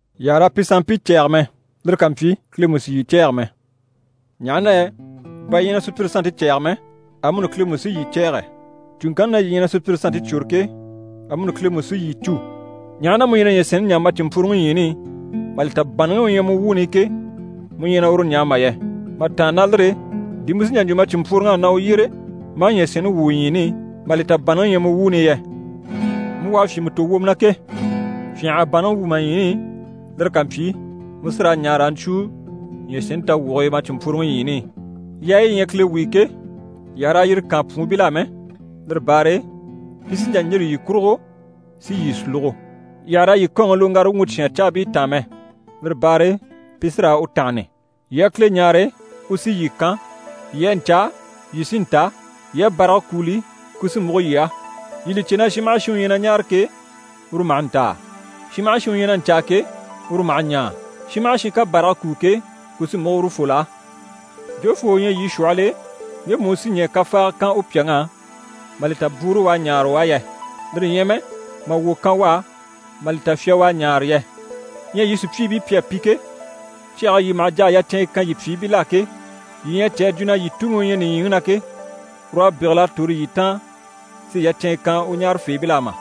Yii àha raa pi sanmpii cɛ̂ɛge mɛ, lire ká mpyi Kile mú sì yii cɛ̂ɛge mɛ. Ɲaha na yɛ bà yii na sùpyire sannte cɛ̂ɛge mɛ, amuni Kile mú sí yii cɛ̂ɛgɛ. Cùŋkanni na yii ɲyɛ na sùpyire sannte cwôre ke, amuni Kile mú sí yii cû. Ɲaha na mu ɲyɛ na ɲyɛ̀sɛnni ɲaa ma cìnmpworoŋi ɲyiini i, mà li ta bànnaŋi u ɲyɛ mu wuuni i ke, mu ɲyɛ na uru ɲaa mà yɛ? Mà tàanna ná lire e, di mu sí n‑jà n‑jwo ma cìnmpworoŋ'á na u yyére ma a ɲyɛ̀sɛnni wwû u ɲyiini i, mà li ta bànnaŋi ɲyɛ mu wuuni i yɛ? Mu u à fyìnmɛ tò wwomɔ na ke, fyânha a bànnaŋi wwû ma ɲyiini i, lire ká mpyi, mu sí raa ɲaa raa ɲcwúu ɲyɛ̀sɛnni tawwuge e ma cìnmpworoŋi ɲyiini i. Yaayi yi ɲyɛ Kile wuyo ke, yii àha raa yire kaan pwuunbil'á mɛ, lire baare e pi sí n‑jà n‑yîri yii kurugo si yii sulugo. Yii àha raa yii kɔ́ɔnŋi loŋgara wuŋi cyáan caabii taan mɛ, lire baare e pi sí raa u tánhani. Yii a Kile ɲáare, u sí yii kan, yii a ɲcaa, yii sí n‑ta, yii a bàrage kúuli, ku sí múgo yii á. Yii li cè na shin maha shin u ɲyɛ na ɲáare ke, uru maha ntaa. Shin maha shin u ɲyɛ na ɲcaa ke, uru maha ɲaa. Shin maha shin ká bàrage kúu ke, ku sí múgo urufol'á. Jofoo u ɲyɛ yii shwɔhɔl'e, ŋgemu u sí ɲɛɛ kafaaga kan u pyàŋ'á, mà li ta bwúuru u à ɲáare u á yɛ? Lire ɲyɛ mɛ, mà wwò kan u á mà li ta fya u à ɲáare yɛ? Ɲyɛ yii sùpyiibii pi à pi ke, cyage e yii maha jà a yacɛnɲyɛ kan yii pyìibil'á ke, yii ɲyɛ a cè a jwo na yii Tuŋi u ɲyɛ nìɲyiŋi na ke, ur'à bégel'a tòro yii taan si yacɛnɲyɛ kan u ɲáarafeebil'á mà?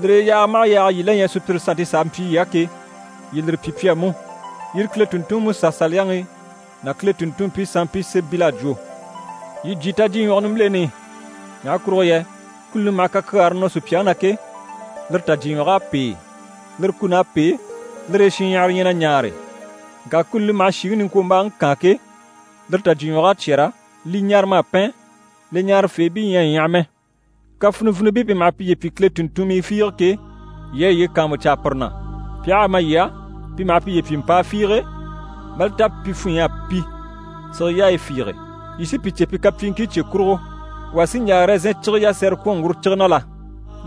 Lire e yaaga maha yaaga yii la ɲyɛ sùpyire sannte s'a mpyi yii á ke, yii lire pyi pi á mú. Yire Kile tùnntunŋi Musa Saliyaŋi ná Kile tùnntunmpii sanmpii sémɛbil'à jwo. Yii jyè tajyiɲwɔge nimbileni i. Ɲaha kurugo yɛ kuni li maha kakyaare nɔ sùpyaŋi na ke, lire tajyiɲwɔg'à pêe, lire kùn'à pêe, lire e shinɲyahara ɲyɛ na ɲaare. Ŋka kuni li maha shìŋi niŋkwombaaŋi kaan ke, lire tajyiɲwɔg'à cyɛ́rɛ, li ɲarama à pɛn, li ɲaarafeebii ɲyɛ a ɲyaha mɛ. Kafinivinibii pi maha piye pyi Kile tùnntunmii fiige ke, yii a yiye kàanmucaa pire na. Pi aha a ma yii á, pi maha piye pyi mpàa fiige, mà li ta pi funɲy'à pi sige yaayi fiige. Yii sí pi cè pi kapyiiŋkii cye kurugo. Wà sí n‑jà ɛrɛzɛn cige yasɛrɛ kwɔ̀n ŋguro cige na la?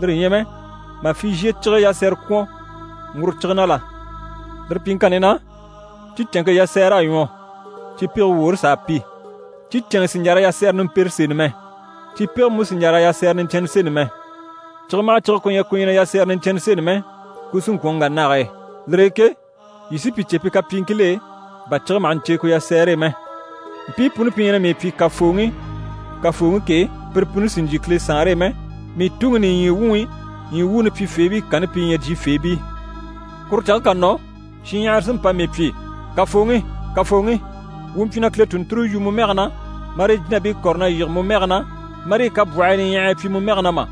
Lire ɲyɛ mɛ, mà fizhiye cige yasɛrɛ kwɔ̀n ŋguro cige na la? Lire pyiŋkanni na, cicɛnŋke yasɛɛr'à ɲwɔ, cipege woore s'à pi. Cicɛnŋɛ sì n‑jà raa yasɛrɛ nimpere seni mɛ. Cipege mú sì n‑jà raa yasɛrɛ niɲcɛnnɛ seni mɛ. Cige maha cige ku ɲyɛ ku ɲyɛ na yasɛrɛ niɲcɛnnɛ seni mɛ, ku sí n‑kwɔ̀n n‑wà nage e. Lire e ke yii sí pi cè pi kapyiiŋkil'e, bà cige maha ɲcè ku yasɛɛre e mɛ. Mpii puni pi ɲyɛ na mii pyi “Kafooŋi, Kafooŋi” ke, pire puni sì n‑jyè Kile Saanre e mɛ, mii Tuŋi nìɲyi wuŋi ɲyii wuuni pyifeebii kanni pi ɲyɛ jyifeebii. Kuru canŋke ká nɔ, shinɲyahara sí n‑pa mii pyi “Kafooŋi, Kafooŋi, wuu mpyi na Kile tùnnture yu mu mɛge na, marii jínabii kɔ̀re na yige mu mɛge na, marii kabwɔhii niɲyahagii pyi mu mɛge na mà?”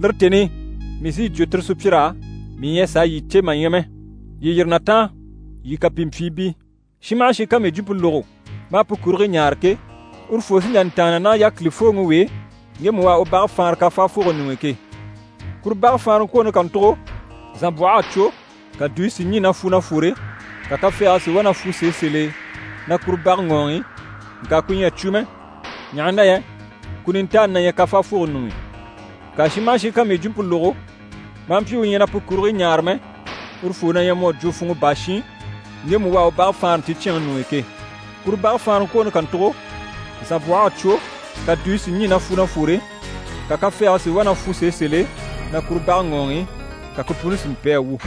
Lire tèni i, mii sí yi jwo tire sùpyir'á “Mii ɲyɛ a sàa yii cè mà ɲya mɛ. Yii yîri na taan, yii kapimpyiibii!” Shin maha shin ká mii jwumpe lógo, maa pu kurigii ɲaare ke, urufoo sí n‑jà n‑tàanna ná yákilifooŋi w'e ŋgemu u à u bage faanra kafaafoge ɲuŋ'i ke. Kuru bage faanraŋkwooni kàntugo, zànbwɔh'à cwo, ka dùyi si ɲî na fwu na fwore, ka kafɛɛge si wá na fwu sèe sèl'e na kuru bage ŋɔɔŋi, ŋka ku ɲyɛ a cwo mɛ, ɲaha na yɛ ku nintaani na ɲyɛ kafaafogo ɲuŋ'i. Ŋka shin maha shin ká mii jwumpe lógo, maa mpyi u ɲyɛ na pu kurigii ɲaare mɛ, urufoo na ɲyɛ mu à jwo funŋɔ baa shin, ŋgemu u à u bage faanra nticyɛnŋi ɲuŋ'i ke. Kuru bage faanraŋkwooni kàntugo, zànbwɔh'à cwo, ka dùyi si ɲî na fwu na fwore, ka kafɛɛge si wá na fwu sèe sèl'e na kuru bage ŋɔɔŋi, ka ku puni si mpi a wu.»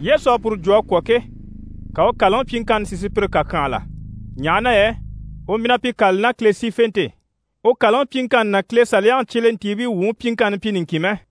Yesu à puru jwumpe jwo a kwɔ̀ ke, ka u kàlaŋi pyiŋkanni si sùpyire kàkyanhala. Ɲaha na yɛ u mpyi na pi kâlali ná Kile sífente e. U kàlaŋi pyiŋkanni ná Kile Saliyaŋi cyelentiibii wuŋi pyiŋkanni mpyi niŋkin mɛ.